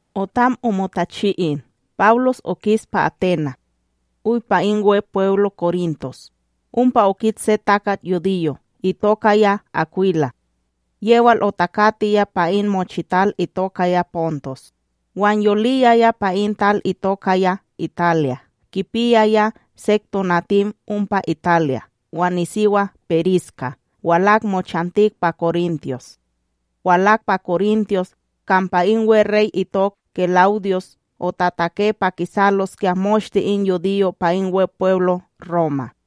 Otam omotachi in, Pawlos okis pa Aténa', oy pa in Wepweblo Korintos. Ompa okit se takat yudiyo itokaya Akwila, yewal otakatiya pa in mochital itokaya Pontos. Wan yoliya pa in tal itokaya Italya, kipiyaya sek tonatim ompa Italya wan nisiwa Periskila walak mochantik pa Korintos walak pa Korintos kampa in weRey itok Kela'udyus otatake pa kisaloskya moshte in yudiyo' pa in Wepweblo Roma.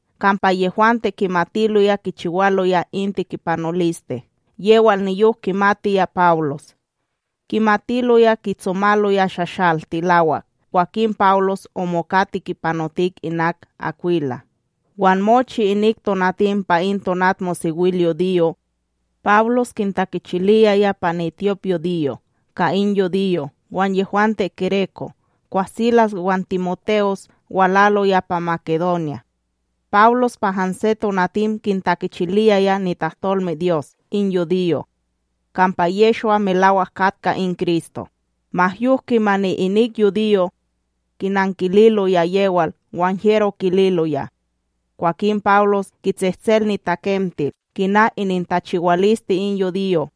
kampa yehwante kimatiloya kichiwaloya in tekipanoliste yewal niyok kimatiya Pawlos, kimatiloya kitsomaloya shashal tilawak kwakin Pawlos omoka tekipanotik inak Akwila. Wan mochi inik tonatim pa in tonatmosewilyudiyo, Pawlos kintakichiliyaya pa nityopYudiyo ka in yudiyo' wan yehwante gereko'. Kwah Silas wan TimoTe'os walaloya pa Makedonya, Pawlos pa hanse tonatim kintakichiliyaya nitahtolmeDyos in yudiyo' kampa Yehshwa melawak katka in Kristo. Ma yok kimani inik yudiyo' kinankililoya yewal wan hyero kililoya, kwakin Pawlos kitsehtsel nitakemtil kina inintachiwaliste in yudiyo'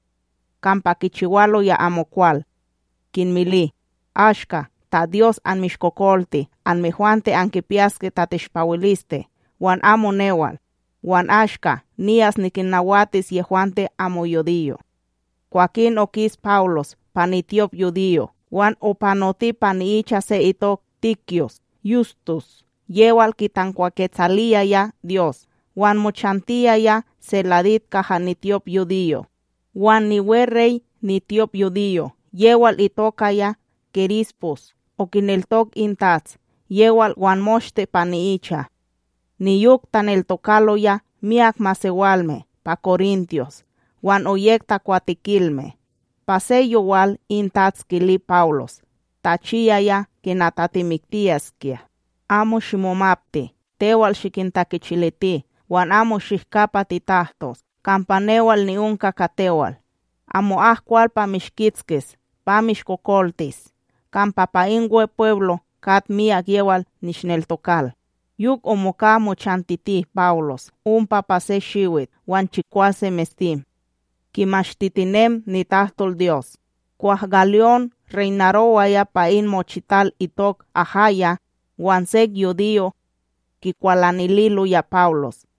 kampa kichiwaloya amokwal, kinmili: —Ashka ta Dyos anmishtakokolti anmehwante ankipiyaske tateshpawiliste wan amo newal. Wan ashka niyas nikinnawatis yehwante amo yudiyo'. Kwakin okis Pawlos pa nityopyudiyo wan opanoti pa ni'icha se itok Tityus Yustus yewal kitankwaketsaliyaya Dyos wan mochantiyaya seladit kaha nityopYudiyo'. Wan niweRey nityopYudiyo' yewal itokaya Kerispus okineltok in TATS yewal wan moshte pa ni'icha. Niyok taneltokaloya myak masewalme pa Korintos wan oyek takwatekilme. Pa se yowal in TATS kili Pawlos tachiyaya kina tatimiktiyaskya: —Amo shimomapti; tewal shikintakichiliti wan amo shihka pa titahtos. Kampa newal ni'onka ka tewal. Amo'ak kwal pa mishkitskis pa mishkokoltis, kampa pa in Wepweblo kat miyak yewal nishneltokal. Yok omoka mochantiti Pawlos ompa pa se shiwit wan chikwase mestim, kimashtitinem nitahtolDyos. Kwah Galyón reynarowaya pa in mochital itok Ahaya, wan sek yudiyo' kikwalanililoya Pawlos.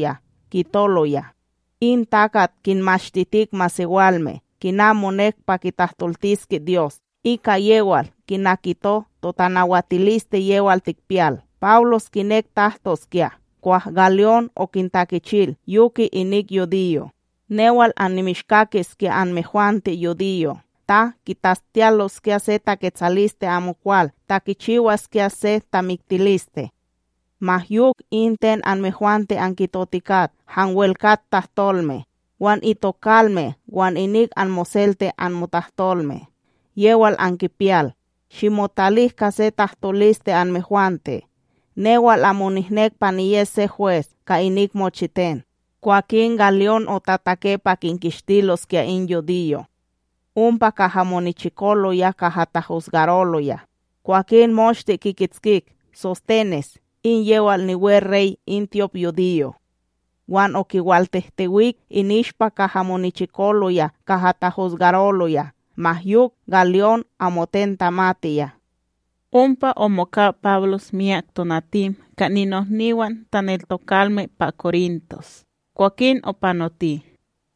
kitoloya: —In takat kinmashtitik masewalme kina monek pa kitahtoltiske Dyos, ika yewal kina kito totanawatiliste yewal tikpiyal. Pawlos kinek tahtoskya kwah Galyón okintakichil yoke inik yudiyo': —Newal annimishkakiskya anmehwante yudiyo' ta kitastiyaloskya se taketsaliste amokwal ta kichiwaskya se tamiktiliste; ma yok in ten anmehwante ankitotikat hanwel kat tahtolme, wan itokalme wan inik anmoselte anmotahtolme yewal ankipiyal, shimotalik ka se tahtoliste anmehwante newal amo nihnek pa niyes se hwes ka inik mochiten. Kwakin Galyón otatake pa kinkistiloskya in yudiyo' ompa kaha monichikoloya kaha tahusgaroloya. Kwakin moshte kikitskik SóStenes, in yewal niweRey in tyopYudiyo', wan okiwaltehtewik ininishpa kaha monichikoloya kaha tahusgaroloya. Ma yok Galyón amoten tamatiya. Ompa omoka Pawlos myak tonatim ka ninohniwan taneltokalme pa Korintos kwakin opanoti,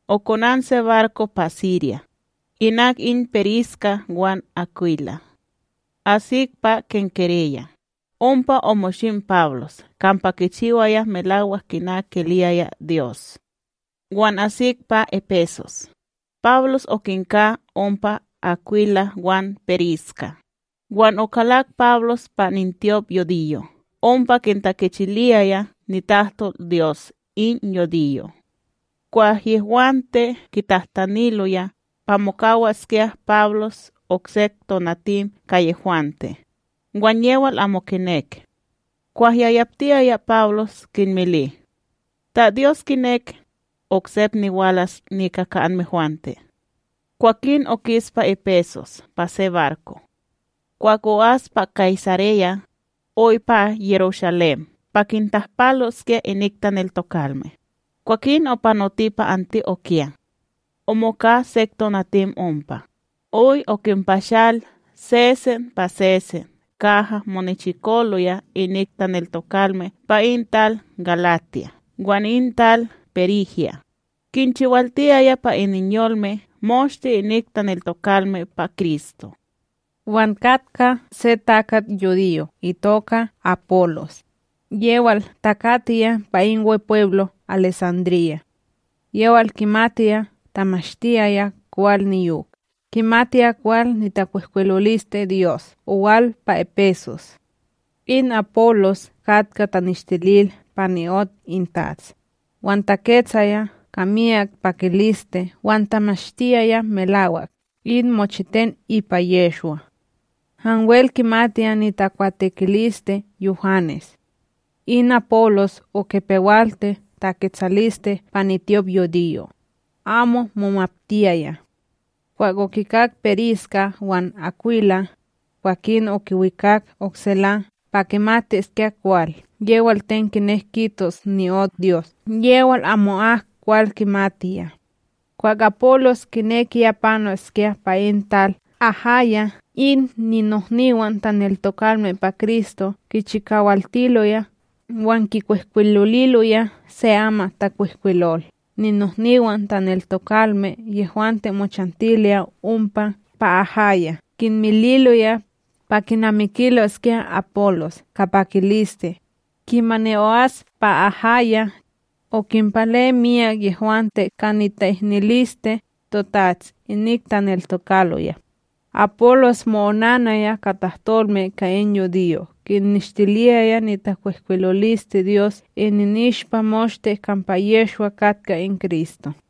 okonan se barko pa Sirya, inak in Periskila wan Akwila. Asik pa Kenkereya, ompa omoshim Pawlos kampa kichiwaya melawak kina kiliyaya Dyos. Wan asik pa Epesos, Pawlos okinka ompa Akwila wan Periskila, wan okalak Pawlos pa nityopYudiyo' ompa kintakichiliyaya nitahtolDyos in yudiyo'. Kwah yehwante kitahtaniloya pa mokawaskya Pawlos oksek tonatim ka yehwante, wan yewal amo kinek. Kwah yayaptiyaya Pawlos kinmili: —Ta Dyos kinek; oksep niwalas nika ka anmehwante. Kwakin okis pa Epesos pa se barko. Kwah o'as pa Kaysareya, oy pa Yerushalém pa kintahpaloskya inik taneltokalme, kwakin opanoti pa Anti'okya. Omoka sek tonatim ompa, oy okinpashal sesen pa sesen kaha monichikoloya inik taneltokalme pa in tal Galatiya wan in tal Perígya, kinchikawaltiyaya pa ininyolme moshte inik taneltokalme pa Kristo. Wan katka se takat yudiyo itoka Apólos, yewal takatiya pa in Wepweblo Alesandríya. Yewal kimatiya tamashtiyaya kwal niyok kimatiya kwal nitakwihkwilolisteDyos owal pa Epesos. In Apólos katka taneshtilil pa ni'ot in TATS, wan taketsaya ka miyak pakiliste wan tamashtiyaya melawak in mochiten ipa Yehshwa, hanwel kimatiya nitakwatekiliste Yuhanes. In Apólos okipewalti taketsaliste pa nityopYudiyo', amo momaptiyaya. Kwah okikak Periskila wan Akwila, kwakin okiwikak oksela pa kimatiskya kwal yewal ten kinek kitos ni'ot Dyos yewal ayamo'ok kwal kimatiya. Kwah Apólos kinekiya panoskya pa in tal Ahaya, in ninohniwan taneltokalme pa Kristo kichikawaltiloya wan kinkwihkwiloliloya se amatTakwihkwilol ninohniwan taneltokalme yehwante mochantiloya ompa pa Ahaya kinmililoya pa kinamikiloskya Apólos ka pakiliste. Kimani o'as pa Ahaya, okinpale miyak yehwante ka nita'ihniliste toTats inik taneltokaloya, Apólos mo'onanaya ka tahtolme ka in yudiyo' kinneshtiliyaya nitakwihkwilolisteDyos ininishpa moshte kampa Yehshwa katka in Kristo.